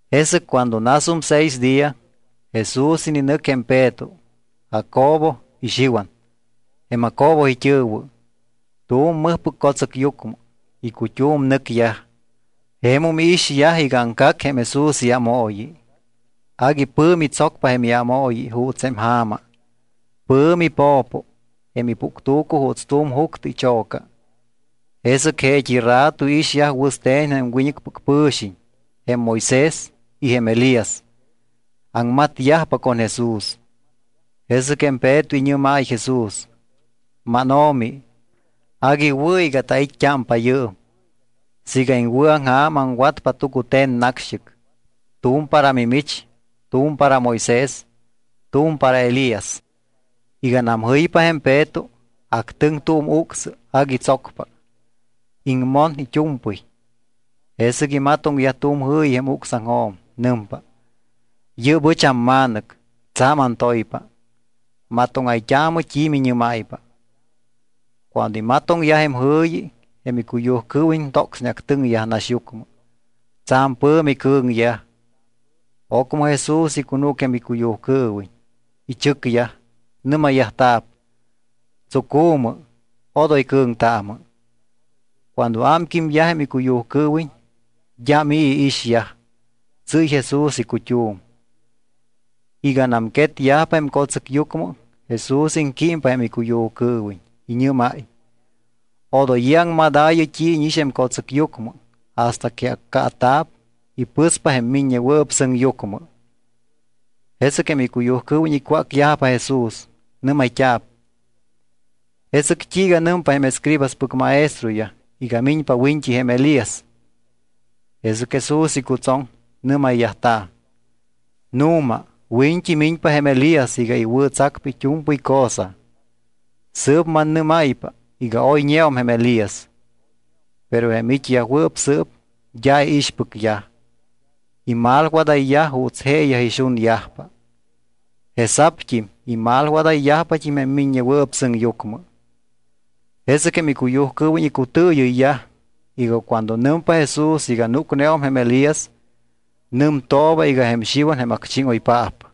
Jesɨc cuando nasum seis día, Jesús ininɨc jém Peto, Jacobo y Xiwan, jém Jacobo it́ɨ̱wɨ, tu̱m mɨjpɨc co̱tsɨcyucmɨ. Icut́um nɨcyaj. Jemum iixyaj iga aŋcac jém Jesús iámooyi. Agui pɨ̱mi tsocpa jém iámooyi juuts jém ja̱ma. Pɨ̱mi po̱po jém ipuctu̱cu juuts tu̱m juctɨ icho̱ca. Jesɨc jeet́i rato iixyaj wɨste̱n jém wiñɨcpɨc pɨ̱xiñ, jém Moisés y jém Elías, aŋmatyajpa con Jesús. Jesɨc jém Peto iñɨ́máy Jesús: —MánO̱mi, agui wɨ̱ iga tait́t́ámpa yɨɨm. Siiga iŋwɨ̱aŋja̱m aŋwatpa tucute̱n nacxt́ɨc, tu̱m para mimich, tu̱m para jém Moisés, tu̱m para jém Elías. Iganam jɨypa jém Peto, actɨŋ tu̱m ucsɨ agui tsocpa. Iŋmon it́u̱mpɨy. Jesɨc imatoŋyaj tu̱m jɨ̱yi jém ucsaŋjo̱m. Nɨmpa: —Yɨ́p ɨch amMa̱nɨc, tsa̱m antoypa. Matóŋayt́aamɨ t́i miñɨ́máypa. Cuando imatoŋyaj jém jɨ̱yi, jém icuyujcɨɨwiñ tocsneactɨŋyaj naxyucmɨ. Tsa̱m pɨ̱mi cɨ̱ŋyaj. Ocmɨ Jesús icunúc jém icuyujcɨɨwiñ, ichɨcyaj, nɨ́mayyajta̱p: —Tsucu̱mɨ. Odoy cɨ̱ŋtaamɨ. Cuando ámquímyaj jém icuyujcɨɨwiñ, d́am i̱ iixyaj. Tsɨ́y Jesús icut́um. Iganam quetyajpa jém co̱tsɨcyucmɨ, Jesús iŋquímpa jém icuyujcɨɨwiñ. Iñɨ́máy: —Odoy i̱ aŋmadaayɨ t́i íñix jém co̱tsɨcyucmɨ hasta que accaata̱p y pɨspa jém Miññewɨɨp Sɨŋyucmɨ. Jesɨc jém icuyujcɨɨwiñ icwácyajpa Jesús. Nɨ́mayt́a̱p: —¿Jesɨc t́iiga nɨmpa jém escribaspɨc maestroyaj iga miñpa wiñt́i jém Elías? Jesɨc Jesús icutsoŋ, nɨ́mayyajta̱: —Nu̱ma, wiñt́i miñpa jém Elías iga iwɨ̱tsacpa it́u̱mpɨy cosa. Sɨɨp mannɨ́máypa iga oyñeum jém Elías, pero jém it́yajwɨɨp sɨɨp d́a iixpɨcyaj. Imalwadayyaj juuts jeeyaj ixunyajpa. Jesa̱pt́im imalwadayyajpat́im jém Miññewɨɨp Sɨŋyucmɨ. Jesɨc jém icuyujcɨɨwiñ icutɨɨyɨyyaj iga cuando nɨmpa Jesús iga núcneum jém Elías, nɨmtooba iga jém Xiwan jém acchíŋoypaap.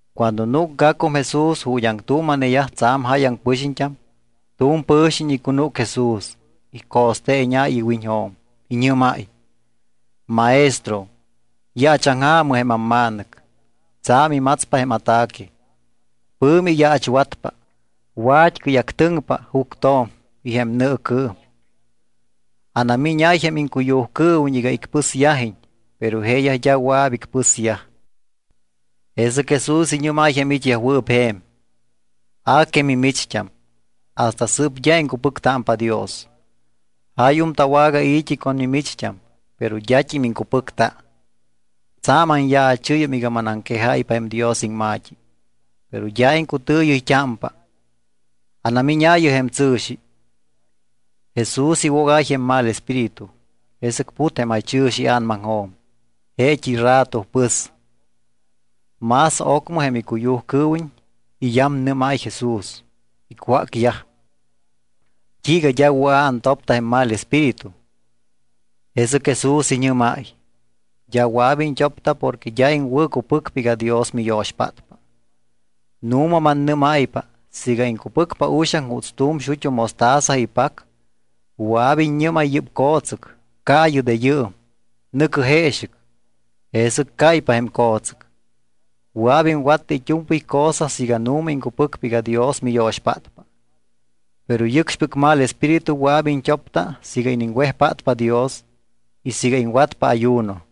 Cuando núcgacum Jesús ju̱t́ aŋtuuma̱neyaj tsa̱m jáyaŋ pɨxiñt́am, tu̱m pɨ̱xiñ icunúc Jesús, ico̱steeñáy iwiñjo̱m. Iñɨ́máy: —Maestro, yaachaŋja̱mɨ jém amma̱nɨc. Tsa̱m imatspa jém ataque. Pɨ̱mi iyaachwatpa. Wat́cɨy actɨŋpa juctjo̱m y jém nɨɨcɨɨm. Anamíñáy jém iŋcuyujcɨɨwiñ iga icpɨsyajiñ, pero jeeyaj d́a wɨa̱p icpɨsyaj. Jesɨc Jesús iñɨ́máy jém it́yajwɨɨp je̱m: —A que mimicht́am, hasta sɨɨp d́a iŋcupɨctámpa Dios. Jáyum tawagai̱t́i con mimicht́am, pero d́at́im iŋcupɨcta. Tsa̱m anyaachɨ́yum iga manaŋquejáypa jém Dios iŋma̱t́i, pero d́a iŋcutɨɨyɨyt́ámpa. Anamíñaayɨ jém tsɨ̱xi. Jesús iwogáy jém mal espíritu, jesɨc put jém jaychɨ̱xi ia̱namaŋjo̱m. Jeet́i rato pɨs. Más ocmɨ jém icuyujcɨɨwiñ iyamnɨ́máy Jesús. Icwácyaj: —¿T́iiga d́a wɨa̱ antopta jém mal espíritu? Jesɨc Jesús iñɨ́máy: —D́a wɨa̱p iñt́opta porque d́a iŋwɨ̱cupɨcpa iga Dios miyo̱xpátpa. Nu̱ma mannɨ́máypa siiga iŋcupɨcpa uxaŋ juuts tu̱m xut́u mostaza ipac, wɨa̱p iññɨ́máy yɨ́p co̱tsɨc: “Caayɨ de yɨɨm, nɨ̱cɨ jeexɨc.” Jesɨc cáypa jém co̱tsɨc. Wɨa̱p iŋwatta it́u̱mpɨy cosa siiga nu̱ma iŋcupɨcpa iga Dios miyo̱xpátpa. Pero yɨcxpɨc mal espíritu wɨa̱p iñt́opta siiga iniŋwejpátpa Dios y siiga iŋwatpa ayuno.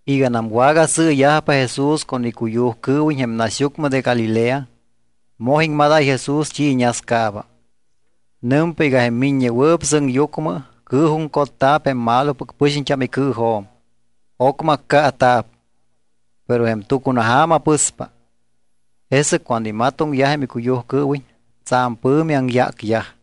Iganam wagasɨɨyajpa Jesús con icuyujcɨɨwiñ jém naxyucmɨ de Galilea, moj iŋmadáy Jesús t́i iñascaaba. Nɨmpa iga jém Miññewɨɨp Sɨŋyucmɨ cɨɨjuŋcotta̱p jém malopɨc pɨxiñt́am icɨɨjo̱m. Ocmɨ accaata̱p, pero jém tucunaja̱ma pɨspa. Jesɨc cuando imatoŋyaj jém icuyujcɨɨwiñ tsa̱m pɨ̱mi aŋyácyaj.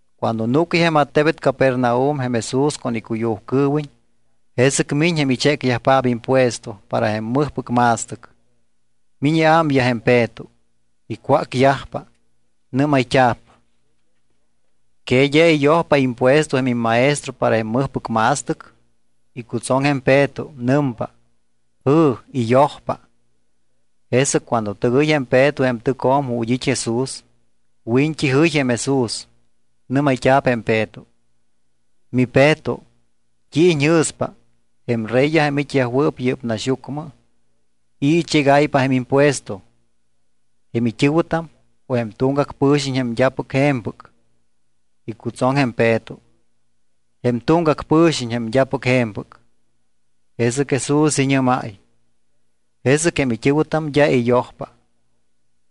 Cuando núcyaj jém attebet Capernaum jém Jesús con icuyujcɨɨwiñ, jesɨc miñ jém ichécyajpaap impuesto para jém mɨjpɨc ma̱stɨc. Miñ iámyaj jém Peto. Icwácyajpa. Nɨ́mayt́a̱p: —¿Que d́a iyojpa impuesto jém immaestro para jém mɨjpɨc ma̱stɨc? Icutsoŋ jém Peto, nɨmpa: —Jɨ̱, iyojpa. Jesɨc cuando tɨgɨy jém Peto jém tɨcjo̱m ju̱t́ it́ Jesús, wiñt́i jɨy jém Jesús, nɨ́mayt́a̱p jém Peto: —MiPeto, ¿t́i iñjɨ̱spa, jém reyyaj jém it́yajwɨɨp yɨ́p naxyucmɨ, i̱ ichégáypa jém impuesto? ¿Jém it́ɨ̱wɨtam o jém tuŋgac pɨ̱xiñ jém d́apɨc je̱mpɨc? Icutsoŋ jém Peto: —Jém tuŋgac pɨ̱xiñ jém d́apɨc je̱mpɨc. Jesɨc Jesús iñɨ́máy: —Jesɨc jém it́ɨ̱wɨtam d́a iyojpa.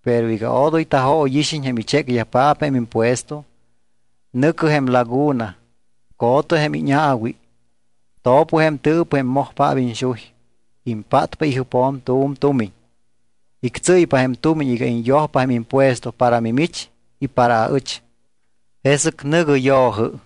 Pero iga odoy tajóyixiñ jém ichécyajpaap jém impuesto, nɨ̱cɨ jém laguna, co̱tɨ jém íñaawi. To̱pɨ jém tɨɨpɨ jém mojpaap iñxuy. Impátpa ijɨpjo̱m tu̱m tumiñ. Ictsɨ́ypa jém tumiñ iga iñyojpa jém impuesto para mimich y para aɨch. Jesɨc nɨ̱gɨ yo̱jɨ.